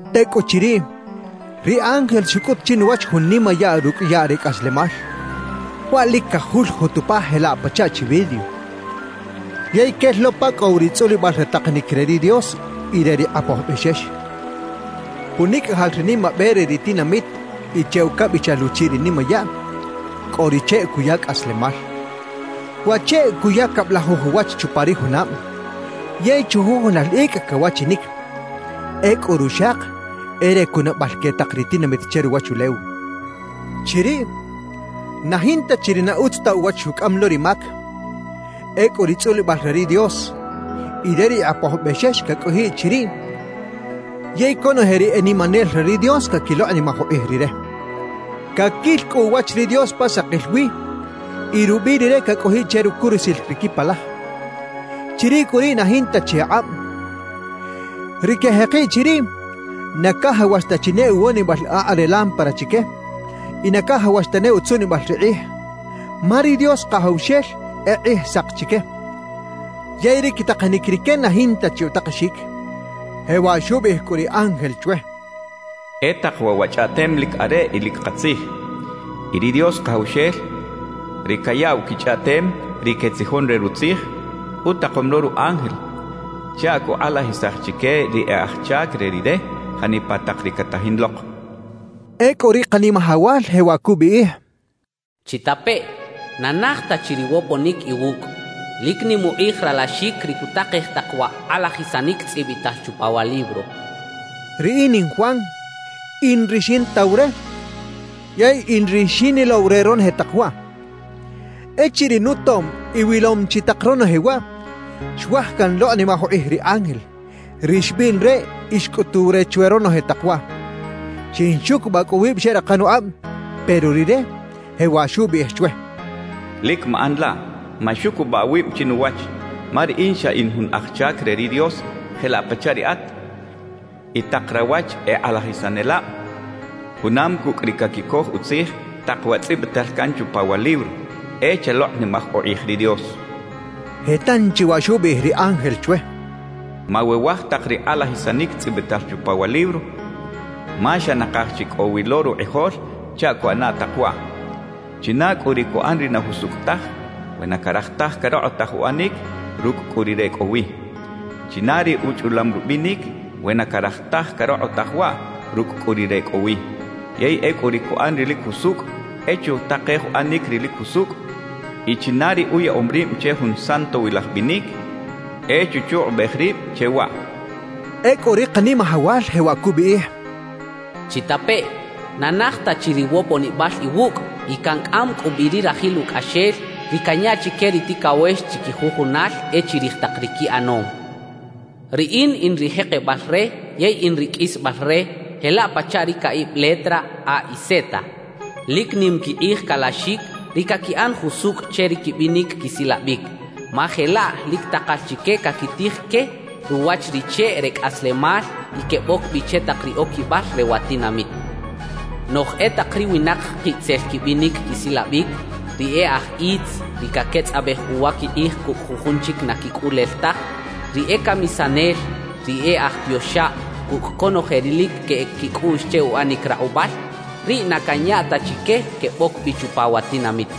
Tekꞌuchiriꞌ, ri ángel xukꞌut chinuwach jun nimayaꞌ rukꞌ yaꞌ re kꞌaslemal, waꞌ lik kajuljut upa jelaꞌ pachaꞌ chi vidrio, yey kel lo pa kꞌo wi ri tzꞌulibꞌal re taqanik re ri Dios y re ri Qꞌapoj Bꞌexex. Punikꞌajal ri nimabꞌe re ri tinamit y che ukabꞌichal uchiꞌ ri nimayaꞌ, kꞌo ri cheꞌ kuya kꞌaslemal. Wa cheꞌ kuya kabꞌlajuj uwach chupa ri junabꞌ, yey chujujunal ikꞌ kawachinik. Ekꞌu ruxaq e re kunabꞌal ke taq ri tinamit che ruwachulew. Chiriꞌ na jinta chi ri na utz ta uwach xukꞌam lo ri mak. Ekꞌu ri tzꞌulibꞌal re ri Dios y re ri Qꞌapoj Bꞌexex kakꞌojiꞌ chiriꞌ yey konoje ri e nimanel re ri Dios kakiloqꞌnimaj uqꞌij Rire. Kakil kꞌu uwach ri Dios pa saqil wi y rubꞌiꞌ Rire kakꞌojiꞌ che rukurusil ri kipalaj. Chiriꞌ kꞌu riꞌ na jinta chi aqꞌabꞌ; ri kejeqiꞌ chiriꞌ na kajawax ta chi ne uwonibꞌal aqꞌ re lámpara chike y na kajawax tane utzuꞌnibꞌal ri qꞌij, ma ri Dios Qajawxel e qꞌijsaq chike. Yey ri kitaqanik rike na jinta chi utaqexik. Jewaꞌ xubꞌiꞌij kꞌu ri ángel chwe: «E taq waꞌ wa chꞌaꞌtem lik areꞌ y lik qatzij. Y ri Dios Qajawxel, ri kayaꞌw kichꞌaꞌtem ri ketzijon re Rutzij, utaqom lo ru ángel chaꞌ kuqꞌalajisaj chike ri e aj chak re Rire janipa taq ri katajin loq» xchaꞌ. Ekꞌu ri Qanimajawal jewaꞌ kubꞌiꞌij: «¡Chitapeꞌ! ¡Na naj ta chi ri woponik iwukꞌ! Lik nim uqꞌij ralaxik ri kutaqej taq wa qꞌalajisanik tzꞌibꞌital chupa wa libro» kachaꞌ. Riꞌin in Juan, in ri xintaw re yey in ri xinilow re ronoje taq waꞌ. Echiriꞌ nutom y wilom chi taq ronoje waꞌ, xuaj kanloqꞌnimaj uqꞌij ri ángel, ri xbꞌiꞌn re y xkꞌutuw re chwe ronoje taq waꞌ; xinxukubꞌaꞌ kꞌu wibꞌ xeꞌraqan uqꞌabꞌ, pero rire jewaꞌ xubꞌiꞌij chwe: «Lik maꞌan laꞌ, maxukubꞌaꞌ awibꞌ chinuwach. Ma riꞌin xa in jun aj chak re ri Dios jelaꞌ pachaꞌ riꞌat y taq rawach e qꞌalajisanelabꞌ, junam kukꞌ ri kakikoj utzij taq wa tzꞌibꞌital kan chupa wa libro. E chaloqꞌnimaj uqꞌij ri Dios» xchaꞌ. Je tanchi waꞌ xubꞌiꞌij ri ángel chwe: «Mawewaj taq ri qꞌalajisanik tzꞌibꞌital chupa wa libro, ma xa naqaj chi kꞌo wi lo ruqꞌijol chaꞌ kuꞌana taq waꞌ. China kꞌu ri kuꞌan ri na jusukꞌ taj, we na karaj taj karoqꞌotaj uꞌanik, rukꞌ kꞌu rire kꞌo wi. China ri uchꞌulam rubꞌinik, we na karaj taj karoqꞌotaj waꞌ, rukꞌ kꞌu rire kꞌo wi. Yey ekꞌu ri kuꞌan ri lik jusukꞌ, e chutaqej uꞌanik ri lik jusukꞌ y china ri uyaꞌom ribꞌ che jun santowilaj bꞌinik, e chuchuqꞌubꞌej ribꞌ che waꞌ» xcha ri ángel. Ekꞌu ri Qanimajawal jewaꞌ kubꞌiꞌij: «¡Chitapeꞌ! Na naj ta chi ri woponibꞌal iwukꞌ y kankꞌam kꞌu bꞌi ri rajil ukꞌaxel, ri kanya chike ri tikawex chikijujunal e chirij taq ri kiꞌanom. Riꞌin in ri jeqebꞌal re yey in ri kꞌisbꞌal re jelaꞌ pachaꞌ ri kaꞌibꞌ letra A y Z. Lik nim kiqꞌij kalaxik ri kakiꞌan jusukꞌ che ri kibꞌinik kisilabꞌik, ma jelaꞌ lik taqal chike kakitij ke ruwach ri cheꞌ re kꞌaslemal y kebꞌok bꞌi che taq ri okibꞌal re wa tinamit. Noꞌj e taq ri winaq qiꞌtzel kibꞌinik kisilabꞌik: ri e aj itz, ri kaketzꞌabꞌej uwa kiqꞌij kukꞌ jujun chik na kikꞌulel taj, ri e kamisanel, ri e aj tioxabꞌ kukꞌ konoje ri lik keꞌek kikꞌuꞌx che uꞌanik raqꞌubꞌal, riꞌ na kanya ta chike kebꞌok bꞌi chupa wa tinamit.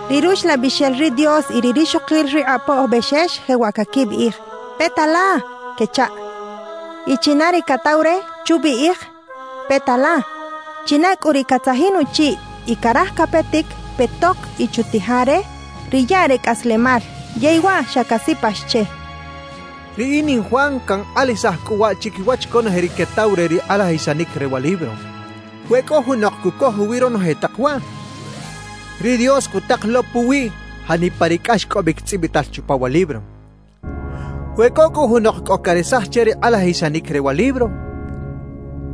Ri Ruxlabꞌixel ri Dios y ri rixoqil ri Qꞌapoj Bꞌexex, jewaꞌ kakibꞌiꞌij: «Peta la» kechaꞌ. Y china ri kataw re, chubꞌiꞌij: «Peta la.» China kꞌu ri katzajin uchiꞌ y karaj kapetik, petoq y chutija re ri yaꞌ re kꞌaslemal, yey waꞌ xa kasipax che. Riꞌin in Juan kanqꞌalajisaj kꞌu waꞌ chikiwach konoje ri ketaw re ri qꞌalajisanik re wa libro: We kꞌo junoq kukoj uwiꞌ ronoje taq waꞌ, ri Dios kutaq lo puwiꞌ janipa ri kꞌaxkꞌobꞌik tzꞌibꞌital chupa wa libro. We kꞌo kꞌu junoq kꞌo karesaj che ri qꞌalajisanik re wa libro,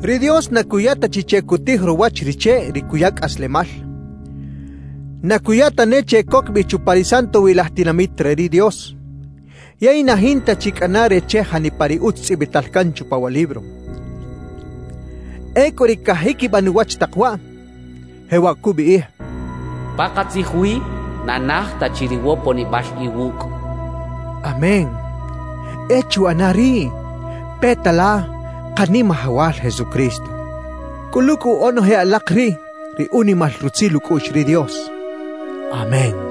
ri Dios na kuya ta chi che kutij ruwach ri cheꞌ ri kuya kꞌaslemal, na kuya tane che kok bꞌi chupa ri santowilaj tinamit re ri Dios, yey na jinta chi kꞌana re che janipa ri utz tzꞌibꞌital kan chupa wa libro. Ekꞌu ri kajikibꞌan uwach taq waꞌ, jewaꞌ kubꞌiꞌij: «Paqatzij wi na naj ta chi ri woponibꞌal iwukꞌ» kacha ri Jesús. ¡Amén! E chuꞌana riꞌ, peta la, Qanimajawal Jesucristo. Kꞌulu kꞌu onoje alaq riꞌ ri unimal rutzil ukꞌuꞌx ri Dios. Amén.